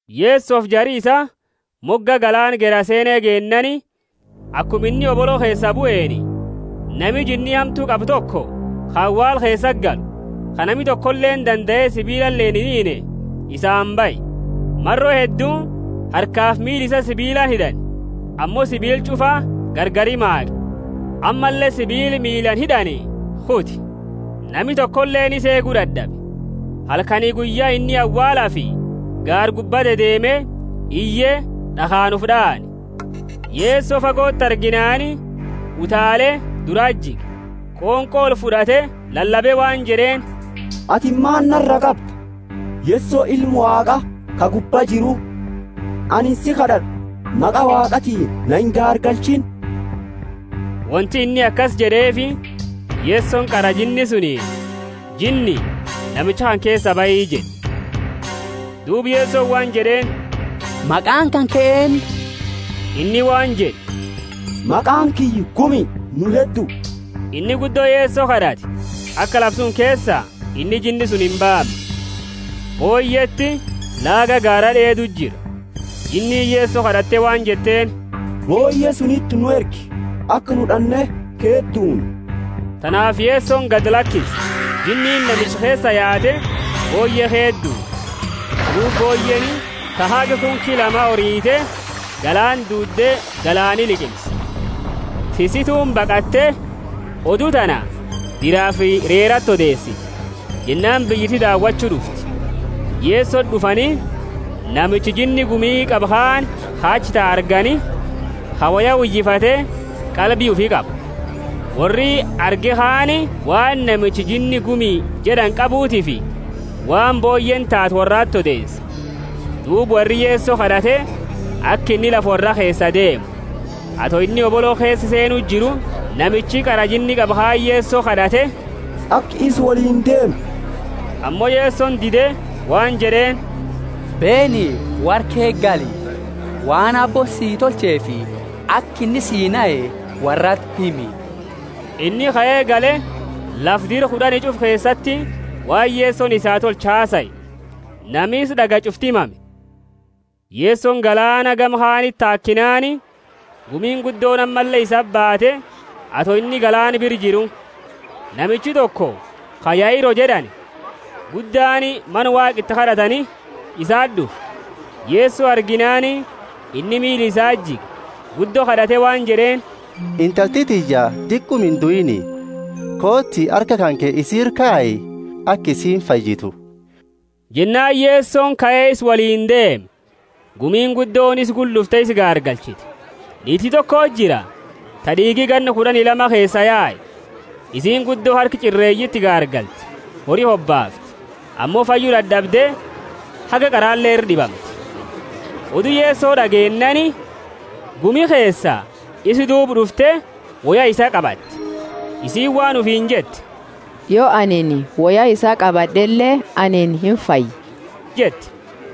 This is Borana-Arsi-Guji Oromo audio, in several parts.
Yesofi jari isaa moga galaana Gerasene geennaani, akuma inni hobolo keesaa bueni, nami jinni hamtu qabu toko, ka awaala keesati galu, ka nami tokoleeni dandae sibiilaleeni inhiinne isaani bahe. Maro heddu harkafi miila isaa sibiilaani hid'ani, ammo sibiila ch'ufa gargari maaqe, ammalle sibiila miilaani hid'ani kute. Nami tokoleeni isa eegu dad'abe. Halkani guyya inni awaalafi gaara gubba dedeeme, iye, d'akhaani ufi d'aane. Yeso fagoti arginaani, utaale, durati jige, qonqo olfud'ate, lalabe waan jed'eeni, Atini maani nara qabda, Yeso, Ilma Waaqa ka gubba jiru? Anini si kad'ad'a, maqa Waaqatiini, na ingaargalchiini. (Wonti inni akasi jed'eefi, Yesoni qara jinni sunini, Jinni, namicha kana keesaa bahi jed'e.) Duuba Yesoni waan jed'eeni, Maqaani kanke eennu? Inni waan jed'e, Maqaani kiyya Gumi, nu heddu. Inni guddo Yeso kad'ate aka lafa suni keesaa inni jinni suni imbaamne. Booyyeti laaga gaara d'eedu jira. Jinniini Yeso kad'atte waan jetteeni, Booyye suniti nu ergi, aka nu d'anne ke duunnu. Tanaafi Yesoni gadi lakise; jinniini namicha keesaa yaate, booyye ke duudde, duuba booyyeeni ta haga kunki lama orite, galaana duudde, galaani liqimse. Tissituuni baqatte, odu tana diraafi reerati odeesite. Jennaani biyyiti dawachu d'ufte. Yesoti d'ufani, namicha jinni gumi qabu kaani, ka achi tau argani, ka woya uyifate, qalbi ufi qabu. Worri arge kaani waan namicha jinni Gumi jed'ani qabutiifi waan booyyeeni taate worrati odeese. Duuba worri Yeso kad'ate, aka inni lafa worraa keesaa deemu. Ato inni hobolo keesa seenu jiru, namichi qara jinni qabu kaani Yeso kad'ate, aka isa woliini deemu. Ammo Yesoni dide, waan jed'eeni, Beeni, worra ke gali, waan Aabbooni sii tolcheefi aka inni sii nahe worrati himi. Inni kae gale, lafa Dira Kud'ani ch'ufa keesati waan Yesoni isaa tolche hasae; nami isa d'agaye ch'ufti mame. Yesoni galaana gama kaaniti taakinaani, gumiini guddooni ammalle isati baate, ato inni galaana bira jiru. Namichi toko, ka Yairo jed'ani, guddaani mana Waaqa iti kad'atani, isati d'ufe. Yeso arginaani, inni miila isati jige, guddo kad'ate waan jed'eeni, Intalti tiyya diquma induiini, kooti, harka kanke isi ira kayi, aka isiini fayyitu. Jennaani Yesoni kae isa woliini deeme, gumiini guddooni isa gula d'ufte isa gaargalchite. Niiti tokoti jira, ta d'iigi ganna kud'ani lama keesaa yae; isiini guddo harka ch'ireeyiti gaargalte, hori hobaafte, ammo fayyu dad'abde haga qarale ira d'ibamte. Odu Yeso d'ageennaani, gumi keesaa isa duuba d'ufte, woya isaa qabatte. Isiini waan ufiini jette, Yo anini woya isaa qabad'ele, anini imfaya jette.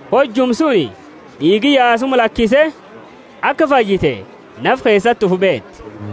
Hojuma suni d'iigi yaasuma lakise, aka fayyite nafa keesati ufi beete.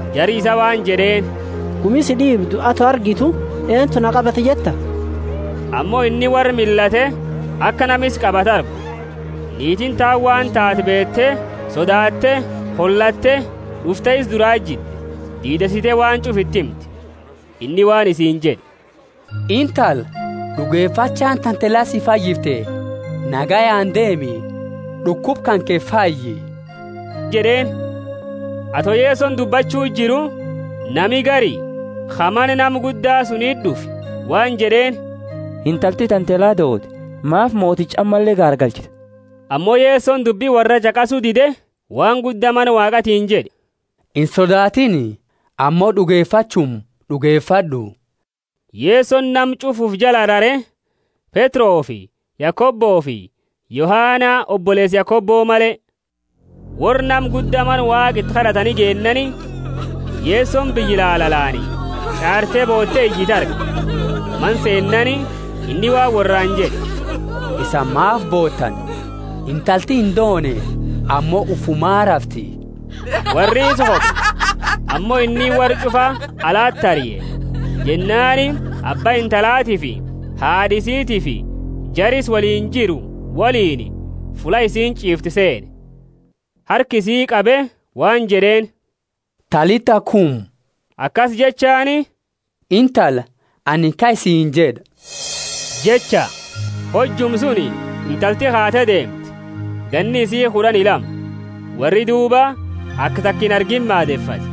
Jari isaa waan jed'eeni, Gumi si d'iibdu, ato argitu, Eentu na qabate jetta? Ammo inni worra millate aka nama isa qabate argu. Niitiini taani waan taate beete, sodaatte, holatte, d'ufte, isa durati jidde, diideesite waan ch'ufa iti himte. Inni waan isiini jed'e, Intala, d'ugefachaani tante la si fayyifte, nagayaani deemi, d'ukuba kanke fayyi jed'eeni. Ato Yesoni dubbachu jiru, nami gari ka mana nama gudda suniti d'ufe waan jed'eeni, Intalti tante la doote; maafi moticha ammalle gaargalchita? Ammo Yesoni dubbi worraa ch'aqasu dide, waan gudda mana Waaqatiini jed'e, Insodaatini, ammo d'ugefachuma d'ugefad'u. Yesoni nama ch'ufa ufi jala rare, Petrofi Yakobofi Yohana oboleesa Yakobo male. Worra nama gudda mana Waaqa iti kad'atani geennaani, Yesoni biyya lalalaani ch'aarte boote iyitu arge. Mana seennaani inni waan worraani jed'e, Isani maafi bootani? Intalti indoone, ammo ufumaa rafti. Worri isa koble, ammo inni worra ch'ufa alati arie, jennaani abba intalatiifi haad'a isitiifi jara isa woliini jiru woliini fulla isiini ch'iiftu seene. Harka isii qabe, waan jed'eeni, Talitha, kumi, akasi jechaani, Intala, anini kai siini jed'a jecha. Hojuma suni intalti kaate deemte. Ganni isii kud'ani lama. Worri duuba aka taka inargiini maadefate.